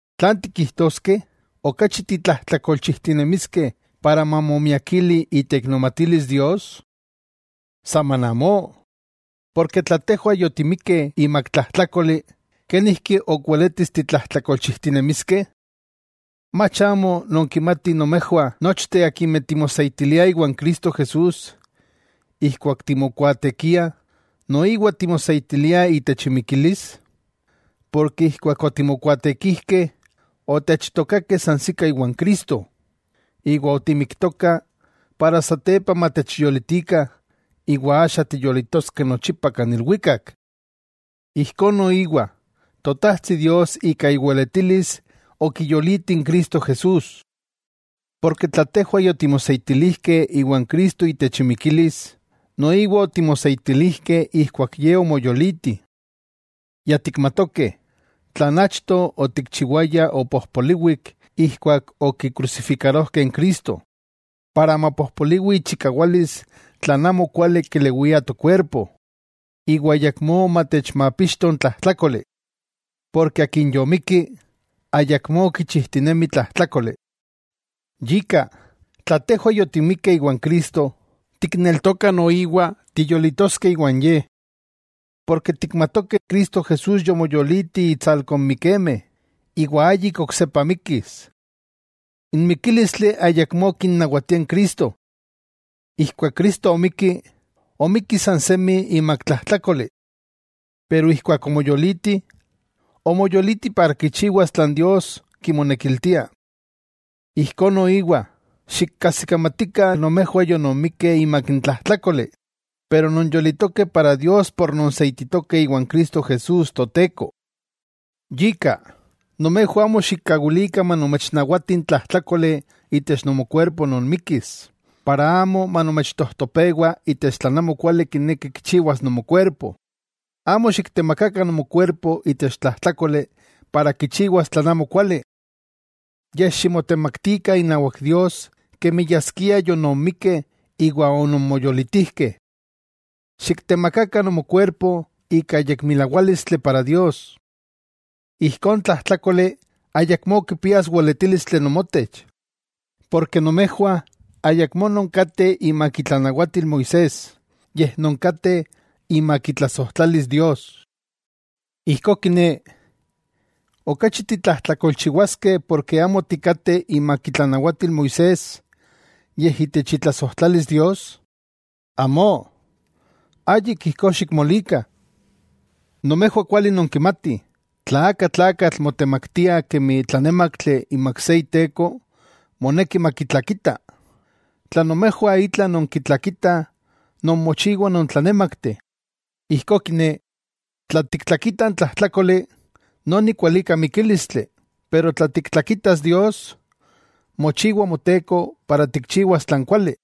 ¿Tlan tikijtoskeh? ¿Okachi titlajtlakolchijtinemiskeh para mamomiakili iteiknomatilis Dios? ¡Saman amó! Porke tla tejwah yotimikkeh imak tlajtlákoli, ¿kenijki ok weletis titlajtlakolchijtinemiskeh? ¿Mach amo nonkimatih nomejwah nochteh akimeh timoseitiliah iwan Cristo Jesús ijkuak timokuaatekiah, noiwa timoseitiliah itech imikilis? Porke ijkuak otimokuaatekijkeh, otechtookakeh sansikah iwan Cristo, iwa otimiktokah para satepa matechyolitikah iwa axa tiyolitoskeh nochipa kan ilwikak. Ijkó noiwa Totajtsi Dios ika iweletilis okiyoliti n Cristo Jesús. Porke tla tejwah yotimoseitilijkeh iwan Cristo itech imikilis, noiwa otimoseitilijkeh ijkuak Ye omoyoliti. Ya tikmatokeh, tlan achto otikchiwayah opojpoliwik ijkuak okikrusifikarojkeh n Cristo, para mapojpoliwi ichikawalis tlan amo kuali kelewia tokuerpo, iwa ayakmó matechmapixto n tlajtlákoli. Porke akin yomikki, ayakmó kichijtinemi tlajtlákoli. Yika, tla tejwah yotimikkeh iwan Cristo, tikneltokah noiwa tiyolitoskeh iwan Ye, porke tikmatokeh Cristo Jesús yomoyoliti itsalko n mikemeh, iwa ayik oksepa mikkis. N mikílistli ayakmó kinawatia n Cristo. Ijkuak Cristo omikki, omikki san semi imak tlajtlákoli. Pero ijkuak omoyoliti, omoyoliti para kichiwas tlan Dios kimonekiltia. Ijkó noiwa, xikajsikamatikah nomejwah yononmikeh imak n tlajtlákoli, pero nonyolitokeh para Dios por nonseititokeh iwan Cristo Jesús Toteko. Yika, nomejwah amo xikkawilikah manomechnawati n tlajtlákoli itech nomokuerpo non mikkis, para amo manomechtojtopewa itech tlan amokuali kineki kichiwas nomokuerpo. Amo xiktemakakah nomokuerpo itech tlajtlákoli para kichiwas tlan amokuali. Yej ximotemaktikah inawak Dios kemi yaskia ononmikkeh iwa ononmoyolitijkeh. Xiktemakakah nomokuerpo ika yekmilawálistli para Dios. Ijkó n tlajtlákoli ayakmó kipias weletílistli nomotech, porke nomejwah ayakmó nonkateh imak itlanawatil Moisés yej nonkateh imak itlasojtlalis Dios. Ijkó kiné, ¿okachi titlajtlakolchiwaskeh porke amo tikateh imak itlanawatil Moisés, yej itech itlasojtlalis Dios? ¡Amó! ¡Ayik ijkó xikmolikah! Nomejwah kuali nonkimatih, tla aka tlakatl motemaktia kemi tlanémaktli imak se iteko moneki makitlakita, tla nomejwah itla nonkitlakitah nonmochiwah nontlanémakteh, ijkó kiné, tla tiktlakita n tlajtlákoli, noni kualika mikílistli, pero tla tiktlakitas Dios, mochiwa Moteko para tikchiwas tlan kuali.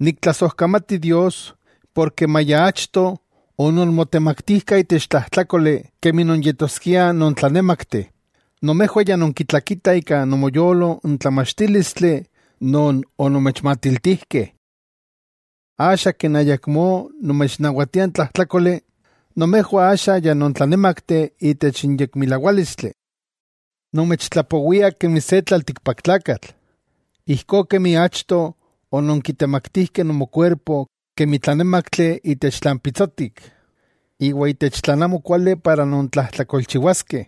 Niktlasojkamati Dios porke maya achto ononmotemaktijkah itech tlajtlákoli kemi nonyetoskiah nontlanémakteh, nomejwah ya nonkitlakitah ika nomoyolo n tlamachtílistli non onomechmatiltijkeh. Axa ken ayakmó nomechnawatia n tlajtlákoli, nomejwah axa ya nontlanémakteh itech n yekmilawálistli. Nomechtlapowia kemi se tlaltikpaktlakatl, ijkó kemi achto ononkitemaktijkeh nomokuerpo kemi tlanémaktli itech tlan pitsotik, iwa itech tlan amokuali para nontlajtlakolchiwaskeh,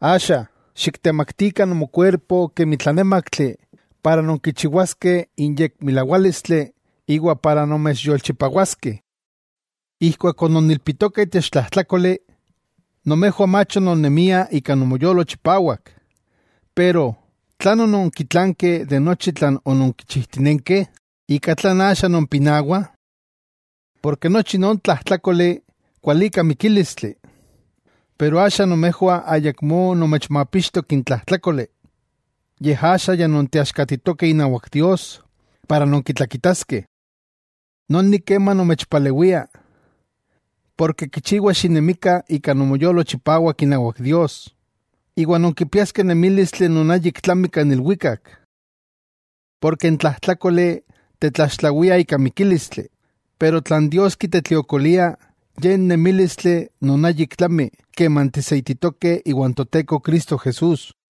axa, xiktemaktikah nomokuerpo kemi tlanémaktli para nonkichiwaskeh n yekmilawálistli iwa para nomechyolchipawaskeh. Ijkuak ononilpitokah itech tlajtlákoli, nomejwah mach ononnemiah ika nomoyolo chipawak. Pero, ¿tlan ononkitlankeh de nochi tlan ononkichijtinenkeh, ika tlan axa nompinawah? Porke nochi non tlajtlákoli kualika mikílistli. Pero axa nomejwah ayakmó nomechmapixtok n tlajtlákoli, yej axa ya nonteaxkatitokeh inawak Dios para nonkitlakitaskeh. Noni kema nomechpalewia, porke kichiwa xinemikah ika nomoyolo chipawak inawak Dios, iwa nonkipiaskeh nemílistli non ayik tlami kan ilwikak. Porke n tlajtlákoli tetlaxtlawia ika mikílistli, pero tlan Dios kitetliokolia ye n nemílistli non ayik tlami keman tiseititokeh iwan Toteko Cristo Jesús.